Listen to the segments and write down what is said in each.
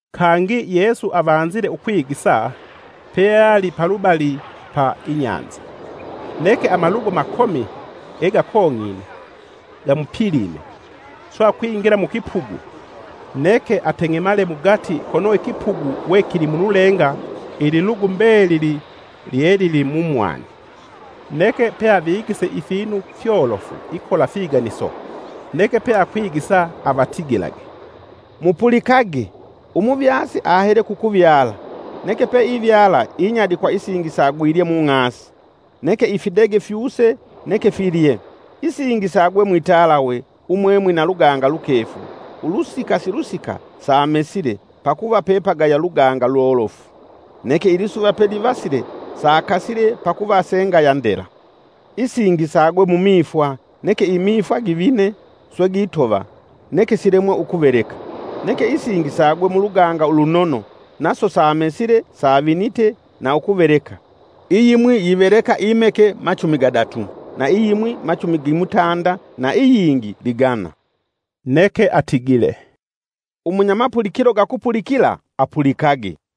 Kangi Yesu avanzile ukwigisa, peali palubali pa inyanza. Neke amalugu makomi gegakong'ine gamupilime, swe akwingila mukipugu neke ateng'emale mugati kono ikipugu we kilimululenga ililugu mbelili lyelili mumwani. Neke peavigise ifinu fyolofu ikola figaniso, neke peakwigisa avatigilage, “Mupulikage! Umuvyasi ahele kukuvyala. Neke peivyala inyadikwa isingi sagwilye mung'asi, neke ifidege fyuse neke filye. Isingi sagwe mwitalawe umwemwina luganga lukefu ulusika silusika samesile, pakuva pepagaya luganga lolofu; Neke ilisuva pelivasile sakasile pakuva sengaya ndela. Isingi sagwe mumifwa neke imifwa givine swe gitova neke silemwe ukuveleka. Neke isingi sagwe muluganga ulunono naso samesile savinite na ukuveleka: iyimwi yiveleka imeke machumi gadatu, na iyimwi machumi gimutanda na iyingi ligana.” Neke atigile, “Umunyamapulikilo gakupulikila, apulikage.”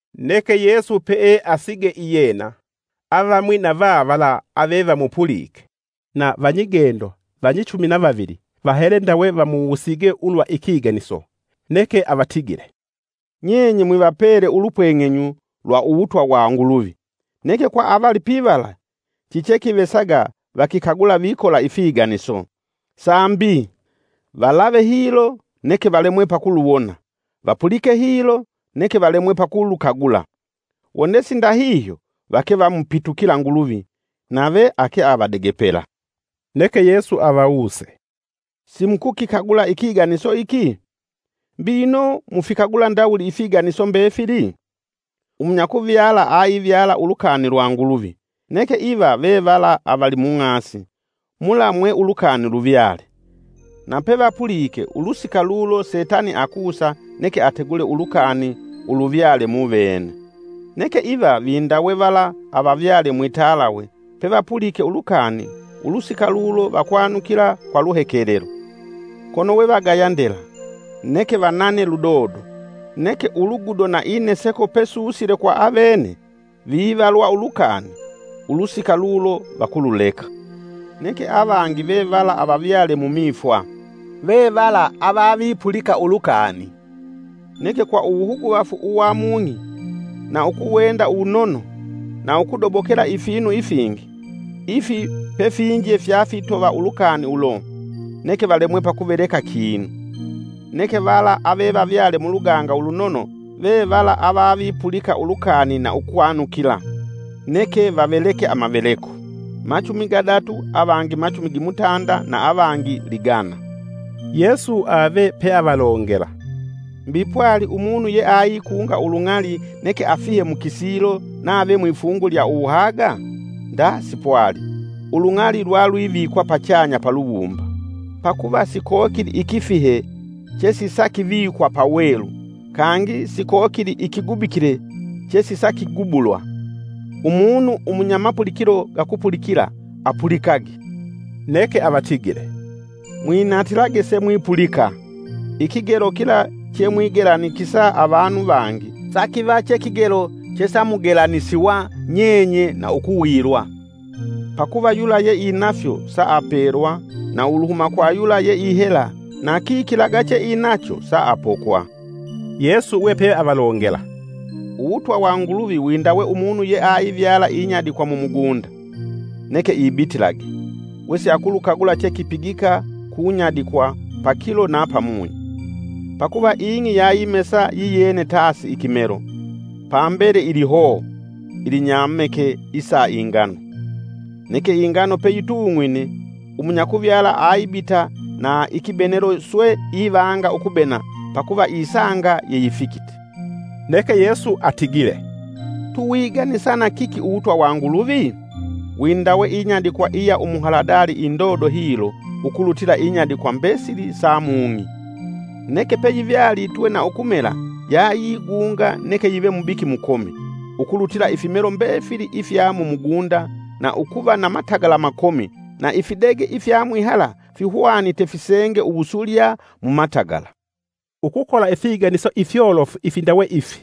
Neke Yesu peeasige iyena, avamwi va vavala avevamupulike na vanyigendo vanyichumi na vavili, vahele ndawe vamuwusige ulwa ikiganiso. Neke avatigile, “Nyenye mwivapele ulupweng'enyu lwa Uwutwa wa Nguluvi, neke kwa avalipivala chichekivesaga vakikagula vikola ifiganiso, Sambi, ‘Valave hilo, neke valemwe pakuluwona, vapulike hilo, neke valemwe pakulukagula. Wone sindahihyo, vake vamupitukila Nguluvi, Nave ake avadegepela.’” Neke Yesu avawuse, “Simukukikagula ikiganiso iki? Mbi ino mufikagula ndawuli ifiganiso mbefili? Umunyakuvyala aivyala ulukani lwa Nguluvi. Neke iva vevala avali mung'asi, mula mwe ulukani luvyale; na pevapulike ulusika lulo Setani akusa neke ategule ulukani uluvyale muvene. Neke iva vindawe vala avavyale mwitalawe pevapulike ulukani ulusika lulo vakwanukila kwa luhekelelo. Kono we vagaya ndela, neke vanane ludodo, neke ulugudo na ineseko pesusile kwa avene vivalwa ulukani ulusika lulo vakululeka. Neke avangi vevala avavyale mumifwa; vevala avavipulika ulukani. Neke kwa uwuhuguvafu uwa mung'i, na ukuwenda uwunono, na ukudobokela ifinu ifingi, ifi pefinje fya fitova ulukani ulo, neke valemwe pakuveleka kinu. Neke vala avevavyale muluganga ulunono vevala avavipulika ulukani na ukwanukila, neke vaveleke amaveleko; machumi gadatu avangi machumi gimutanda, na avangi ligana.” Yesu ave peavalongela, “Mbi pwali umunu yeaikunga ulung'ali neke afihe mukisilo nave mwifungu lya uwuhaga? Nda sipwali, ulung'ali lwalwivikwa pachanya paluwumba. Pakuva sikokili ikifihe, chesisakivikwa pawelu, kangi sikokili ikigubikile chesisakigubulwa. Umunu umunya mapulikilo gakupulikila apulikage.” Neke avatigile, “Mwinatilage semwipulika! Ikigelo kila chemwigelanikisa avanu vangi sakiva che kigelo chesamugelanisiwa nyenye na ukuwilwa. Pakuva yula yeinafyo saapelwa, na uluhuma kwa yula yeihela na kikilaga cheinacho saapokwa.” Yesu we peavalongela, “Uwutwa wa Nguluvi windawe umunu yeaivyala inyadikwa mumugunda. Neke ibitilage, wesiakulukagula chekipigika kunyadikwa pakilo na pamunyi. Pakuva ing'i yayimesa yiyene tasi ikimelo, pambele ilihoo ilinyameke isa ingano. Neke ingano peyitung'wine umunyakuvyala aibita na ikibenelo swe ivanga ukubena pakuva isanga yeyifikite.” Neke Yesu atigile, “Tuwiganisa na kiki uwutwa wa Nguluvi? Windawe inyadikwa iya umuhaladali indodo hilo ukulutila inyadikwa mbesili sa mung'i. Neke peyivyalitwe na ukumela yayigunga neke yive mubiki mukomi, ukulutila ifimelo mbefili ifya mumugunda na ukuva na matagala makomi, na ifidege ifya mwihala fihwanite fisenge uwusulya mumatagala.” Ukukola ifiganiso ifyolofu ifindawe ifi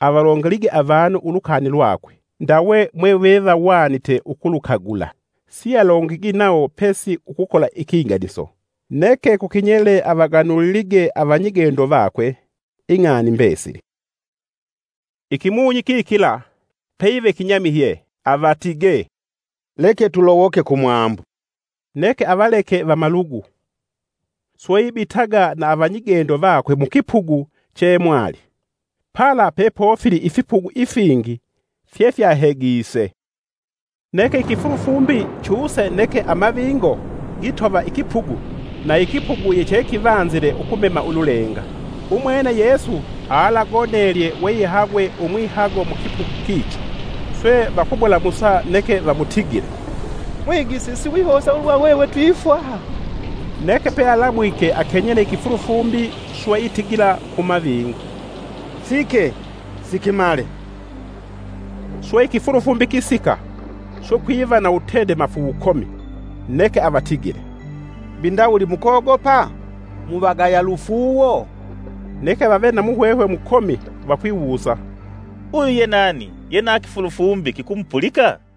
avalongelige avanu ulukani lwakwe, ndawe mwevevahwanite ukulukagula. Sialongigi nawo pesi ukukola ikiganiso, neke kukinyele avaganulilige avanyigendo vakwe ing'ani mbesili. Ikimunyi kikila, peyive kinyamihye avatige, “Leke tulowoke kumwambu.” Neke avaleke vamalugu, swe ibitaga na avanyigendo vakwe mukipugu cheemwali. Pala pepofili ifipugu ifingi fyefyahegise. Neke ikifulufumbi chuse neke amavingo gitova ikipugu na ikipugu yechekivanzile ukumema ululenga. Umwene Yesu alagonelye weihagwee umwihago mukipugu kicho, swe vakumulamusa neke vamutigile, “Mwigisi siwihosa ulwa hwehwe twifwa?” Neke pealamuke akenyele ikifulufumbi swe itigila kumavingo, “Sike! Sikimale!” Swe ikifulufumbi kisika swe kwiva na wutendemafu wukomi. Neke avatigile, “Mbi ndawuli mukogopa? muvagaya lufuuwo?” Neke vave na muhwehwe mukomi vakwiwusa, “Uyu ye nani ye na ikifulufumbi kikumupulika?”